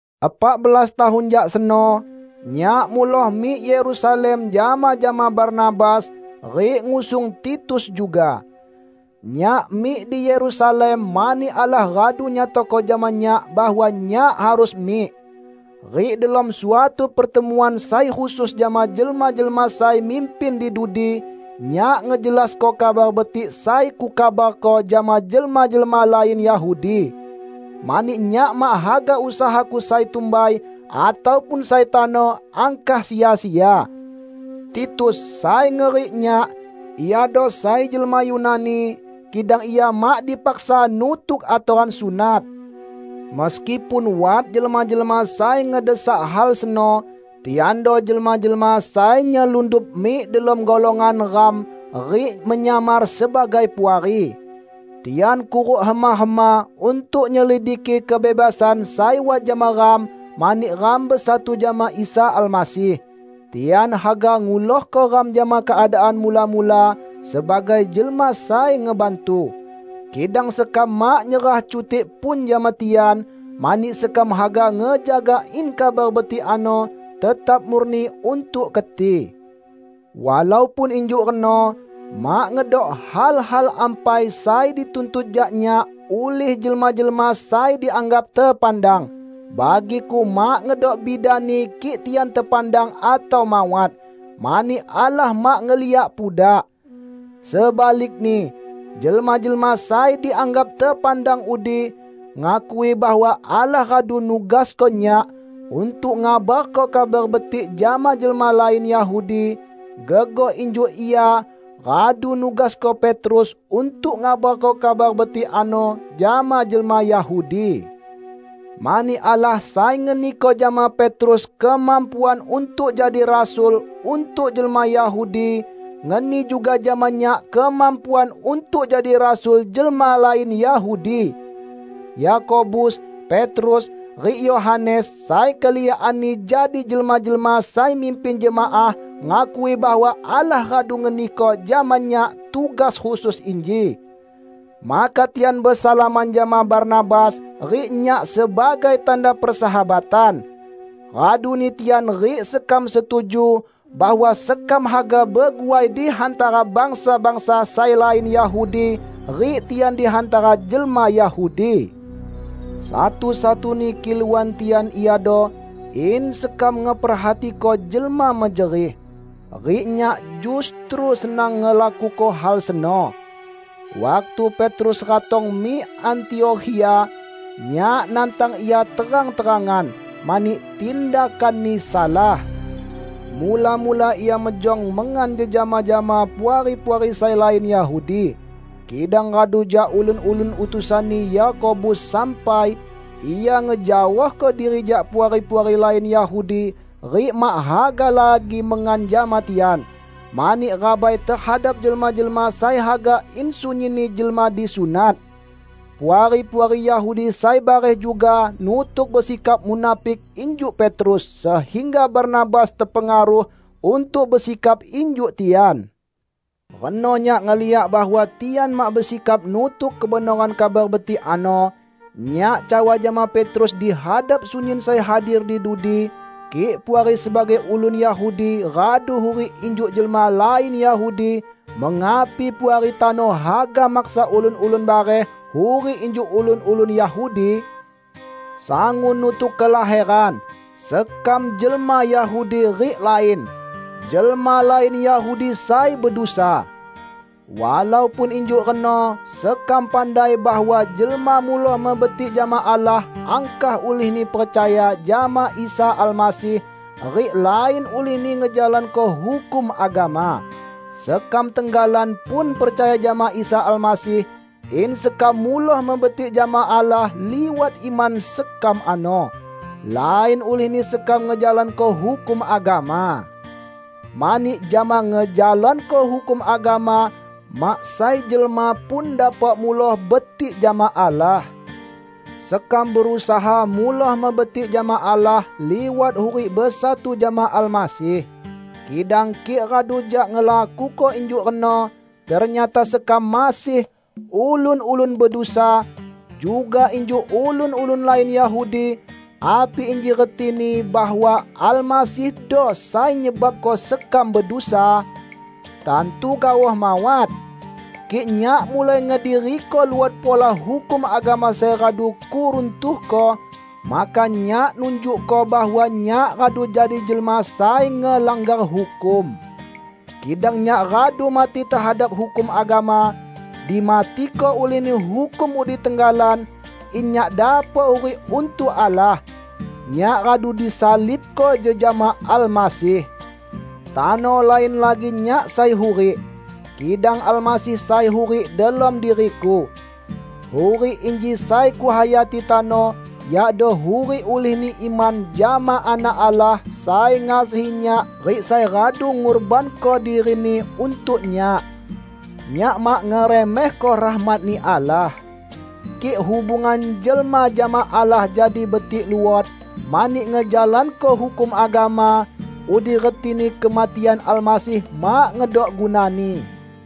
Epak belas tahun jak seno, nyak muloh mik Yerusalem jama-jama Barnabas, rik ngusung Titus juga. Nyak mik di Yerusalem mani Allah radu nyatako jama nyak bahwa nyak harus mik. Rik delom suatu pertemuan sai khusus jama jelma-jelma sai mimpin di dudi, nyak ngejelasko Kabar Betik sai kukabarko jama jelma-jelma lain Yahudi. Mani nyak mak haga usahaku sai tumbai, ataupun sai tano, angkah sia-sia. Titus, sai ngerik nyak, iado sai jelma Yunani, kidang ia mak dipaksa nutuk atoran sunat, meskipun wat jelma-jelma sai ngedesak hal seno. Tiando jelma-jelma sai nyelundup mik delom golongan ram rik menyamar sebagai puari. Tian kuruk hema-hema untuk nyelidiki kebebasan sai wat jama ram mani ram besatu jama Isa Almasih. Tian haga ngulohko ram jama keadaan mula-mula sebagai jelma sai ngebantu, kidang sekam mak nyerah cutik pun jama tian, mani sekam haga ngejaga in Kabar Betik ano tetap murni untuk keti. Walaupun injuk reno, mak ngedok hal-hal ampai sai dituntut jak nyak ulih jelma-jelma sai dianggap tepandang -- bagiku mak ngedok bidani kik tian tepandang atau mawat, mani Allah mak ngeliak pudak. Sebalikni, jelma-jelma sai dianggap tepandang udi ngakui bahwa Allah radu nugasko nyak untuk ngabarko Kabar Betik jama jelma lain Yahudi, gegoh injuk Ia radu nugasko Petrus untuk ngabarko Kabar Betik ano jama jelma Yahudi. Mani Allah sai ngeniko jama Petrus kemampuan untuk jadi rasul untuk jelma Yahudi, ngeni juga jama nyak kemampuan untuk jadi rasul jelma lain Yahudi. Yakobus, Petrus, rik Yohanes, sai keliakanni jadi jelma-jelma sai mimpin jemaah, ngakui bahwa Allah radu ngeniko jama nyak tugas khusus inji. Maka tian besalaman jama Barnabas rik nyak sebagai tanda persahabatan. Raduni tian rik sekam setuju bahwa sekam haga beguai di hantara bangsa-bangsa sai lain Yahudi, rik tian di hantara jelma Yahudi. Satu-satuni kiluan tian iado in sekam ngeperhatiko jelma mejerih. Rik nyak justru senang ngelakuko hal seno. Waktu Petrus ratong mik Antiokhia, nyak nantang ia terang-terangan, mani tindakanni salah. Mula-mula ia mejong mengan jejama jama puari-puari sai lain Yahudi. Kidang radu jak ulun-ulun utusanni Yakobus sampai, ia ngejaohko diri jak puari-puari lain Yahudi rik mak haga lagi mengan jama tian, mani rabai tehadap jelma-jelma sai haga in sunyinni jelma disunat. Puari-puari Yahudi sai bareh juga nutuk besikap munafik injuk Petrus, sehingga Barnabas tepengaruh untuk besikap injuk tian. Reno nyak ngeliak bahwa tian mak besikap nutuk kebenoran Kabar Betik ano, nyak cawa jama Petrus di hadap sunyin sai hadir di dudi, "Kik Puari sebagai ulun Yahudi radu hurik injuk jelma lain Yahudi, mengapi Puari tano haga maksa ulun-ulun bareh hurik injuk ulun-ulun Yahudi?" Sangun nutuk kelaheran, sekam jelma Yahudi rik lain "jelma lain Yahudi sai bedusa". Walaupun injuk reno sekam pandai bahwa jelma muloh mebetik jama Allah angkah ulihni percaya jama Isa Almasih, rik lain ulihni ngejalanko hukum agama. Sekam tenggalan pun percaya jama Isa Almasih, in sekam muloh mebetik jama Allah liwat iman sekam ano, lain ulihni sekam ngejalanko hukum agama. Mani jama ngejalanko hukum agama, mak sai jelma pun dapok muloh betik jama Allah. Sekam berusaha muloh mebetik jama Allah liwat hurik besatu jama Almasih. Kidang kik radu jak ngelakuko injuk reno, ternyata sekam masih "ulun-ulun bedusa" juga injuk ulun-ulun lain Yahudi, api inji retini bahwa Almasihdo sai nyebabko sekam bedusa? Tantu gaoh mawat! Kik nyak mulai ngediriko luot pola hukum agama sai radu kuruntuhko, maka nyak nunjukko bahwa nyak radu jadi jelma sai ngelanggar hukum. Kidang nyak radu mati tehadap hukum agama -- dimatiko ulihni hukum udi tenggalan -- in nyak dapok hurik untuk Allah. Nyak radu disalibko jejama Almasih. Tano lain lagi nyak sai hurik, kidang Almasih sai hurik delom diriku. Hurik inji sai kuhayati tano yakdo hurik ulihni iman jama Anak Allah sai ngasihi nyak rik sai radu ngurbanko diri-Ni untuk nyak. Nyak mak ngeremehko rahmat-Ni Allah. Kik hubungan jelma jama Allah jadi betik luot mani ngejalanko hukum agama, udi retini kematian Almasih mak ngedok gunani!